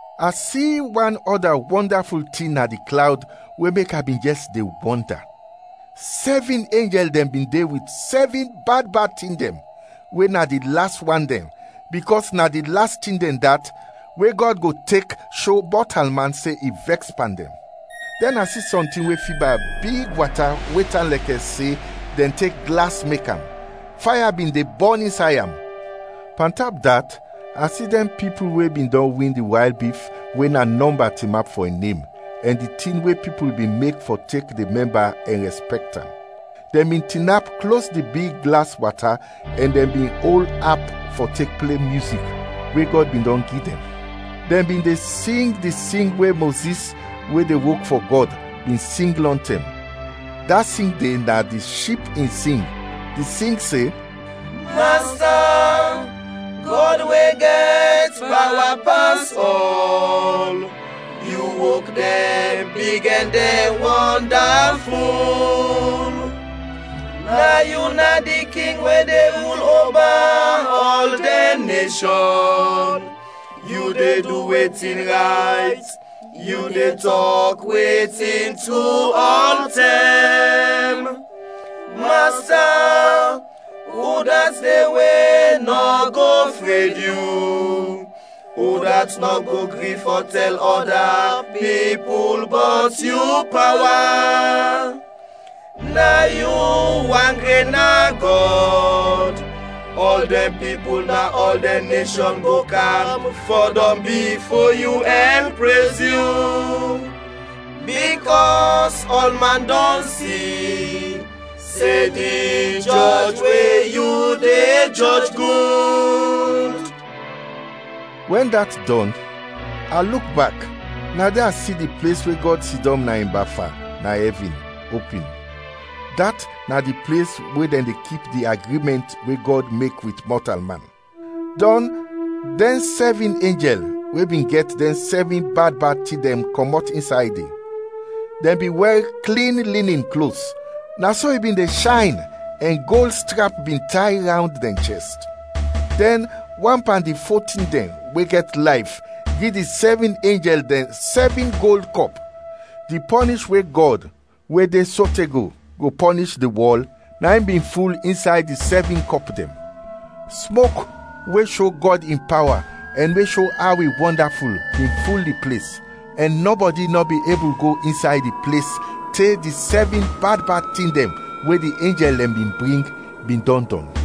A si wan ɔda wɔndaful tin na di klawd we mek a bin jɛs de wɔnda. Sɛvin enjɛl dɛn bin de wit sɛvin bad bad tin dɛn, we na di las wan dɛn, bikɔs na di las tin dɛn dat, we Gɔd go tek sho mɔtalman se in vɛks pan dɛn. Dɛn a si sɔntin we fiba big wata we tan lɛkɛ se dɛn tek glas mek am, faya bin de bɔn insay am. Pantap dat, a si dɛn pipul we bin dɔn win di wayl bif, we na nɔmba tinap fɔ in nem, ɛn di tin we pipul bin mek fɔ tek de mɛmba ɛn rɛspɛkt am. Dɛn bin tinap klos di big glas wata ɛn dɛn bin ol ap fɔ tek ple myuzik, we Gɔd bin dɔn gi dɛn. Dɛn bin de sing di sing we Mozis, we de wok fɔ Gɔd, bin sing lɔntɛm. Da sing de na di Ship in sing; di sing se, “Masta, Gɔd we gɛt pawa pas ɔl, yu wok dɛn big ɛn dɛn wɔndaful! Na yu na di king we de rul oba ɔl dɛn neshɔn, yu de du wetin rayt, yu de tɔk wetin tru ɔltɛm! Masta, udat de we nɔ go fred yu? Udat nɔ go gri fɔ tɛl ɔda pipul bɔt yu pawa? Na yu wan gren na Gɔd. Ɔl dɛn pipul na ɔl dɛn neshɔn go kam fɔdɔm bifo yu ɛn prez yu, bikɔs ɔlman dɔn si se di jɔj we yu de jɔj, gud.” Wɛn dat dɔn, a luk bak, na de a si di ples we Gɔd sidɔm na in bafa na ɛvin opin, dat na di ples we dɛn de kip di agrimɛnt we Gɔd mek wit mɔtalman. Dɔn dɛn sɛvin enjɛl we bin gɛt dɛn sɛvin bad bad tin dɛn kɔmɔt insay de; dɛn bin wɛr klin linin klos, na so i bin de shayn, ɛn gold strap bin tay rawnd dɛn chɛst. Dɛn wan pan di fo tin dɛn we gɛt layf gi di sɛvin enjɛl dɛn sɛvin gold kɔp; di pɔnish we Gɔd, we de sote go, go pɔnish di wɔl, na in bin ful insay di sɛvin kɔp dɛn. Smok we sho Gɔd in pawa ɛn we sho aw i wɔndaful bin ful di ples, ɛn nɔbɔdi nɔ bin ebul go insay di ples te di sɛvin bad bad tin dɛn we di enjɛl dɛn bin bring, bin dɔn dɔn.